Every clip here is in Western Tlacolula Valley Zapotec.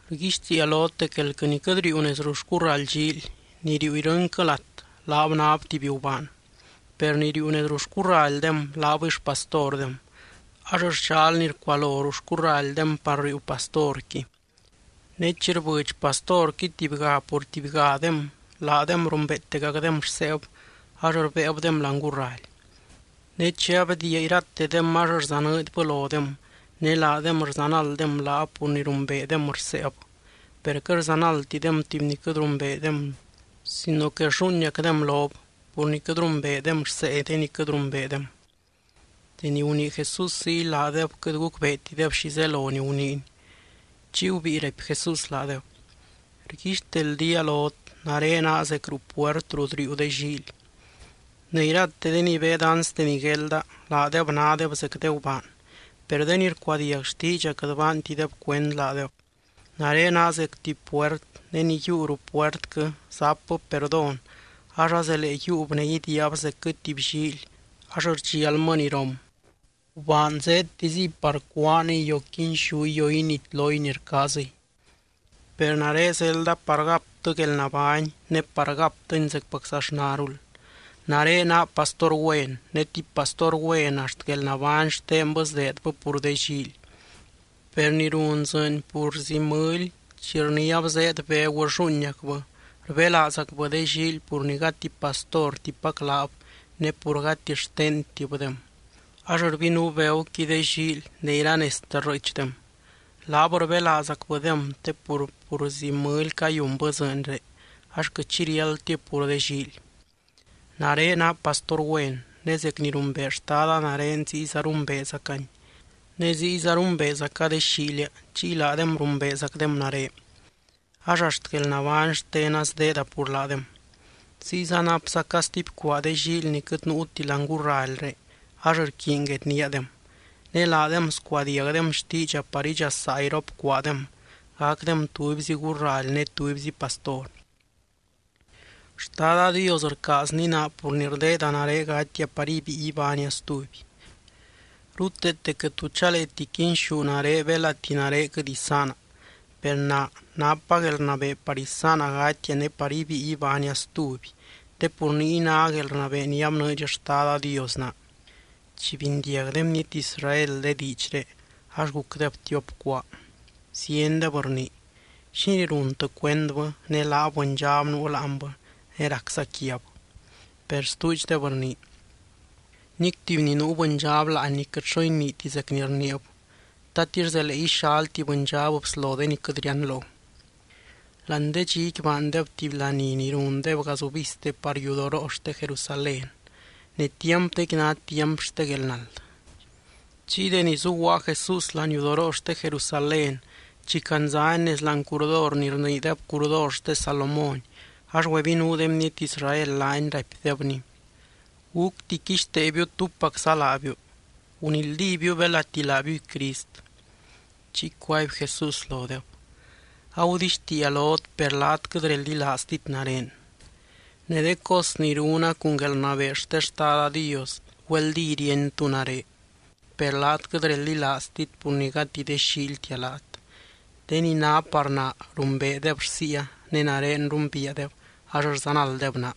’Rguixtiia lot dec elquɨ ni quɨt riiu nez ruu xcurraly llíily, ni riiu irɨnquɨ lat, laab náb tuby gubaan. Per ni riiu nez ruu xcurralydem laabɨy xpastordem ax rxal ni rcualo ruu xcurralydem par riiu pastorqui. Ne chi rbɨdx pastorqui tubyga pur tubygadem, laadem rumbeetegacdem rseeb ax rbéebdem láani gurraly. Ne chi abdiia iratedem ax rzanɨɨdybɨ lodem ne laadem rzanalddem laab pur ni rumbeedem rseeb. Per quɨt rzanaldtidem tuby ni quɨt rumbeedem sino que rlluuiniacdem lob, pur ni quɨt rumbeedem rsee de ni quɨt rumbeedem. Deni gunii Jesús ziy, laadeb quɨt gucbeetideb xi zelo ni guniiny. Chiy gubíi raipy Jesús laadeb: —Rguixteldía lot nare naa zec ruu puert rut riiu de llíily. Ne irate de ni beed anste ni guelda laadeb nádeb zec de gubaan. Per de ni rcuadiag xtiidxa quɨt baantideb cuend laadeb. Nare naa zec tuby puert, ne ni yiiu ruu puertquɨ zapbɨ perdón ax azelee yiiub ne idiiab zecquɨ tuby llíily ax rdxialmɨ ni rom. ’Gubaan zéedtiziy par cúaaniy o quinxúy o initloy ni rcaaziy. Per nare zelda par gaptɨ guelnabány ne par gaptɨni zecpaczaxnarul. Nare naa pastor güen, ne tuby pastor güen axt guelnabány xtenbɨ sdeedbɨ pur de llíily. Per ni run dzɨɨny purzi mɨly, chi rniáb zéed begu rlluuiniacbɨ, rbelaazgacbɨ de llíily pur ni gati pastortipac laab ne pur gati xtentibdem. Ax rbinuu beguqui de llíily ne iranezte rrɨɨchdem. Laab rbelaazgacbɨdem, te pur purzi mɨly cayunbɨ dzɨɨnré ax quɨt xi riáldtib pur de llíily. ’Nare naa pastor güen. Ne zec ni rumbee Xtada nare ziyza rumbeezacany. Ne ziyza rumbeezaca de xíilia chiy laadem rumbeezacdem nare. Ax axt guelnabány xtena sdeeda pur laadem. Ziyza napzaca stuby cuaa de llíily ni quɨt nuuti láani gurralyré ax rquiiny guedníadem. Ne laadem scuadiagdem xtiidxa par idxasaa irop cuaadem, gacdem tubyzi gurraly ne tubyzi pastor. ’Xtada Dios rcaazny naa pur ni rdeeda nare gatia par ibíi ibánia stuby. Ruteete quɨt tu chaleeti quinxú nare belati nare quɨt isaana. Per naa napa guelrnabee par isaana gatia ne par ibíi ibánia stuby, te pur niy ná guelrnabee ni abnɨɨdx Xtada Dios naa. Chi bindiag de bniety Israel de diidxré, ax gucdeb tiop cuaa. Ziendeb rnii: —¿Xínii runtɨ cuendbɨ? Ne laab bɨndxab nuu láanbɨ ne racza quiab. Per stuudxdeb rnii: —Nic tuby ni nuu bɨndxab láanni quɨt xo iniiti zec ni rniib. ¿Tatix zelee ixal tuby bɨndxab bslo de ni quɨt rianlo? Láani de dxiqui baandeb tuby laní ni rundeb gazubizte par yudoroo xte Jerusalén. Ne tiampdequi ná tiamp xte guelnald. Chiy deni zuguaa Jesús láani yudoroo xte Jerusalén, chi candzany nez láani curdor ni rniideb curdor xte Salomón, ax gubinuu de bniety Israel laany, raipdebny: —¿Gúcti quixteebiu túpacza laabiu? Gunildíbiu belati laabiuy Crist. Chiy cuaby Jesús lodeb: —Agudixtiia lot per laat quɨt reldilaaztit nare. Ne de cos ni runa cun guelrnabee xte Xtada Dios, güeldí ríeny tú nare. Per laat quɨt reldilaaztit, pur ni gati de xíiltia laat. De ni ná par naa, rumbeedeb rsiia, ne nare rumbiiadeb ax rzanalddeb naa.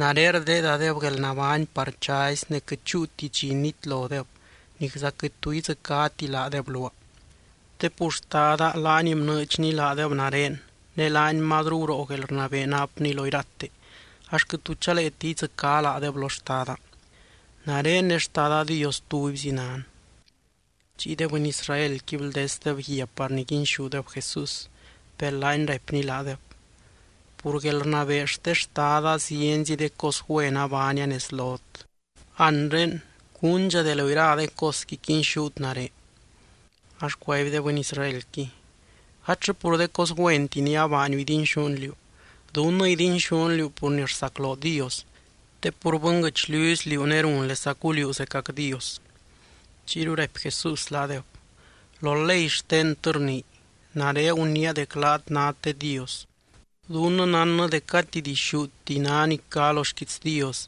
Nare rdeedadeb guelnabány par chazy, ne quɨt chúuti dxi nitlodeb, nicza quɨt tu idzɨcáti laadeb luaa. Te pur Xtada laany bnɨɨdxny laadeb nare ne laany mazru guroo guelrnabee napny lo irate, ax quɨt tu chaleeti idzɨcá laadeb lo Xtada. Nare ne Xtada Dios tubyzi nan. Chiy de bɨny Israelqui bldesdeb guia par niguinxúdeb Jesús. Per laany raipny laadeb: —Pur guelrnabee xte Xtada zienzi de cos güen abaania nez lot. Anre, ¿cúndxa de lo ira de cosqui quinxút nare? Ax cuaby de bɨny Israelqui: —Gatllɨ pur de cos güenti ni abaaniu idinxún liú. Dunnɨ idinxún liú pur ni rsacloo Dios. Te pur bɨnguɨchliuzy liú ne runlesacu liú zecac Dios. Chiyru raipy Jesús laadeb: —Lo ley xtentɨ rnii: “Nare guniia dec laat nát de dios.” Dunnɨ nánnɨ dec gati dixúti ná ni cá lo xquiits Dios,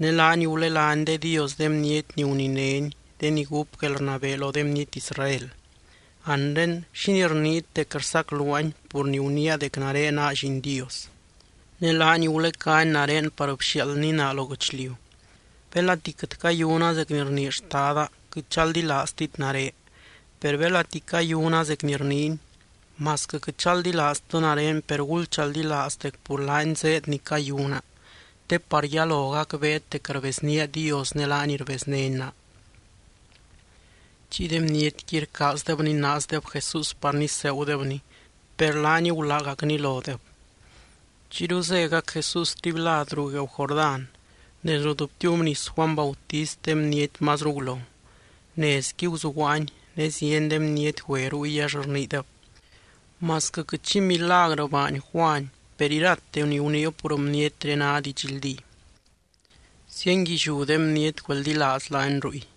ne laany gulelány de dios de bniety ni guninény, de ni gúp guelrnabee lo de bniety Israel. Anre, ¿xínii rniit dec rsacluaany pur ni guniia dec nare naa Lliin Dios? Ne laany gulecány nare par bxiaaldny naa lo guɨchliu. Belati quɨt cayuna zec ni rnii Xtada, quɨt chaldilaaztit nare. Per belati cayuna zec ni rniiny, masquɨ quɨt chaldilaaztɨ nare per gulchaldilaaz dec pur laany zéed ni cayuna, te par yalo gacbeet dec rbeznía Dios ne laany rbeznény naa. Chiy de bnietqui rcaazdeb ninaazdeb Jesús par niseegudebny, per laany gulágacny lodeb. Chiyru zégac Jesús stuby lad ruu gueeu Jordán, nez rut btiubnis Juany Bautist de bniety mazru gulo. Nezqui guzuguaany ne zieny de bniety güe ruy, ax rniideb: —Masquɨ quɨt xi milagrɨ baany Juany, per irate ni guniib pur bnietré ná didxldí. Zienguilliú de bniety güeldilaaz laany ruy.